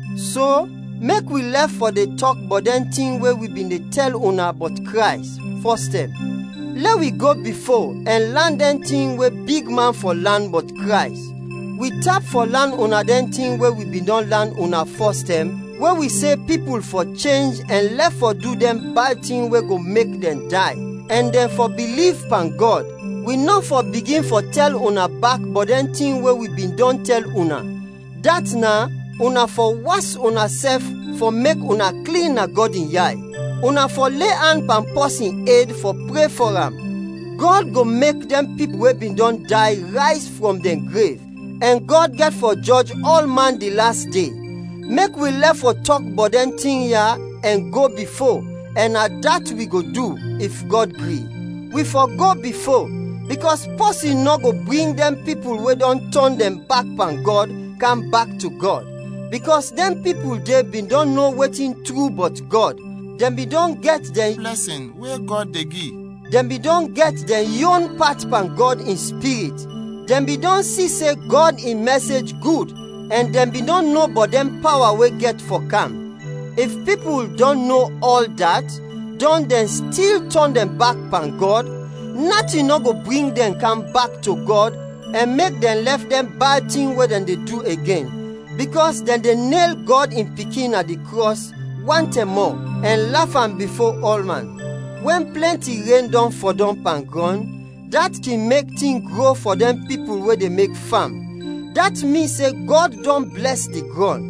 So, mek wi lɛf fɔ de tɔk bɔt dɛn tin we wi bin de tɛl una bɔt Krays, fɔstɛm; lɛ wi go bifo ɛn lan dɛn tin we bigman fɔ lan bɔt Krays. Wi tap fɔ lan una dɛn tin we wi bin dɔn lan una fɔstɛm we wi se pipul fɔ chenj ɛn lɛf fɔ du dɛn bad tin we go mek dɛn day, ɛn dɛn fɔ biliv pan Gɔd. Wi nɔ fɔ bigin fɔ tɛl una bak bɔt dɛn tin we wi bin dɔn tɛl una, dat is: una fɔ was unasɛf fɔ mek una klin na Gɔd in yay; una fɔ le an pan pɔsin ed fɔ pre fɔ am; Gɔd go mek dɛn pipul we bin dɔn day rayz frɔm dɛn grev; ɛn Gɔd gɛt fɔ jɔj ɔlman di las de. Mek wi lɛf fɔ tɔk bɔt dɛn tin ya ɛn go bifo; ɛn na dat wi go du, if Gɔd gri. Wi fɔ go bifo, bikɔs pɔsin nɔ go bring dɛn pipul we dɔn tɔn dɛn bak pan Gɔd, kam bak to Gɔd, bikɔs dɛn pipul de bin dɔn no wetin tru bɔt Gɔd, dɛn bin dɔn gɛt dɛn blɛsin we Gɔd de gi, dɛn bin dɔn gɛt dɛn yon pat pan Gɔd in Spirit, dɛn bin dɔn si se Gɔd in mɛsej gud, ɛn dɛn bin dɔn no bɔt dɛn pawa we gɛt fɔ kam. If pipul dɔn no ɔl dat, dɔn dɛn stil tɔn dɛn bak pan Gɔd, natin nɔ go bring dɛn kam bak to Gɔd ɛn mek dɛn lɛf dɛn bad tin we dɛn de du, igen, bikɔs dɛn de nel Gɔd in Pikin na di krɔs wan tɛm mɔ ɛn laf am bifo ɔlman. Wɛn plɛnti ren dɔn fɔdɔm pan grɔn, dat kin mek tin gro fɔ dɛn pipul we de mek fam, dat min se Gɔd dɔn blɛs di grɔn.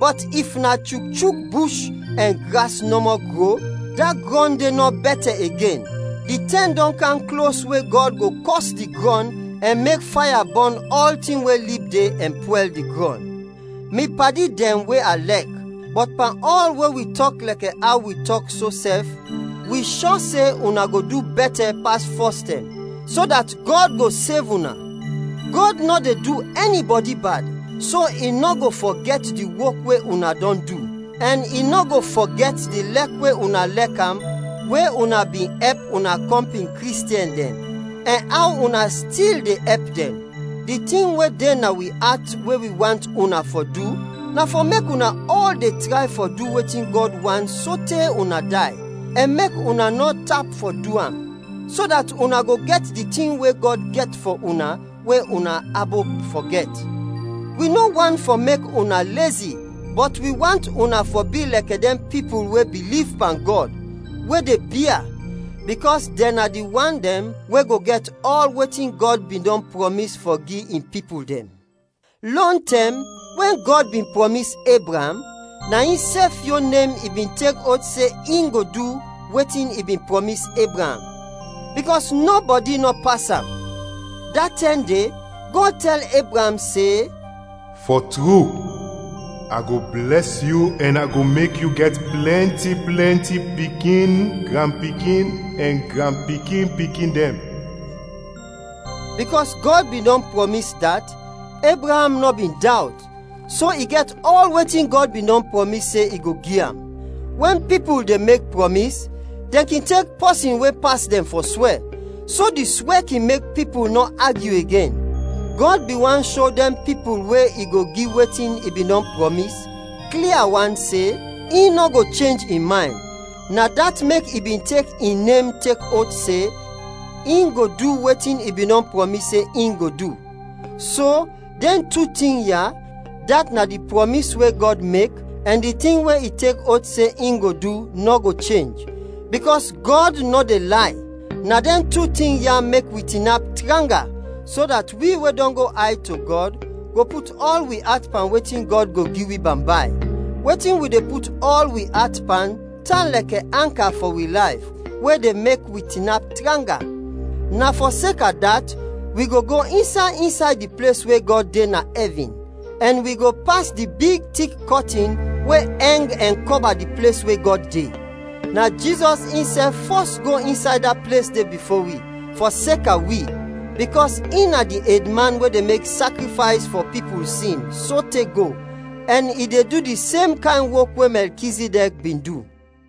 Bɔt if na chukchuk bush ɛn gras nɔmɔ gro, da grɔn de nɔ bɛtɛ igen. Di tɛm dɔn kam klos we Gɔd go kɔs di grɔn ɛn mek faya bɔn ɔltin we lib de ɛn pwɛl di grɔn. Mi padi dɛn we a lɛk, bɔt pan ɔl we wi tɔk lɛkɛ aw wi tɔk so sɛf, wi shɔ se una go du bɛtɛ, pas fɔstɛm, so dat Gɔd go sev una. Gɔd nɔ de du ɛnibɔdi bad, so i nɔ go fɔgɛt di wok we una dɔn du, ɛn i nɔ go fɔgɛt di lɛk we una lɛk am we una bin ɛp una kɔmpin Kristiɛn dɛn, ɛn aw una stil de ɛp dɛn. Di tin we de na wi at we wi want una fɔ du, na fɔ mek una ɔl de tray fɔ du wetin Gɔd want sote una day, ɛn mek una nɔ tap fɔ du am, so dat una go gɛt dɛn tin we Gɔd gɛt fɔ una we una abop fɔ gɛt. Wi nɔ want fɔ mek una lezi, bɔt wi want una fɔ bi lɛkɛ dɛn pipul we biliv pan Gɔd, we de bia, bikɔs dɛn na di wan dɛn, we go gɛt ɔl wetin Gɔd bin dɔn prɔmis fɔ gi in pipul dɛn. Lɔntɛm, wɛn Gɔd bin prɔmis Ebraam, na insɛf yon nem i bin tek oth se in go du wetin i bin prɔmis Ebraam, bikɔs nɔbɔdi nɔ pas am. Da tɛm de, Gɔd tɛl Ebraam se, “Fɔ tru, a go blɛs yu ɛn a go mek yu gɛt plɛnti plɛnti pikin, granpikin, ɛn granpikin-pikin dɛn.” Bikɔs Gɔd bin dɔn prɔmis dat, Ebraam nɔ bin dawt, so i gɛt ɔl wetin Gɔd bin dɔn prɔmis se i go gi am. Wɛn pipul de mek prɔmis, dɛn kin tek pɔsin we pas dɛn fɔ swɛ, so di swɛ kin mek pipul nɔ agyu igen. Gɔd bin want sho dɛn pipul we i go gi wetin i bin dɔn prɔmis, klia wan se, in nɔ go chenj in maynd. Na dat mek i bin tek in nem tek oth se, in go du wetin i bin dɔn prɔmis se in go du. So, dɛn tu tin ya, dat na di prɔmis we Gɔd mek ɛn di tin we i tek oth se in go du, nɔ go chenj, bikɔs Gɔd nɔ de lay. Na dɛn tu tin ya mek wi tinap tranga, so dat wi we dɔn go ayd to Gɔd, go put ɔl wi at pan wetin Gɔd go gi wi bambay. Wetin wi de put ɔl wi at pan tan lɛkɛ anka fɔ wi layf, we de mek wi tinap tranga. Na fɔseka dat, wi go go insay insay di ples we Gɔd de na ɛvin, ɛn wi go pas di big tik kɔtin we ɛng ɛn kɔba di ples we Gɔd de. Na Jizɔs insɛf fɔs go insay da ples de bifo wi, fɔseka wi; bikɔs in na di edman we de mek sakrifays fɔ pipul sin, sote go, ɛn i de du di sem kayn wok we Mɛlkizidɛk bin du.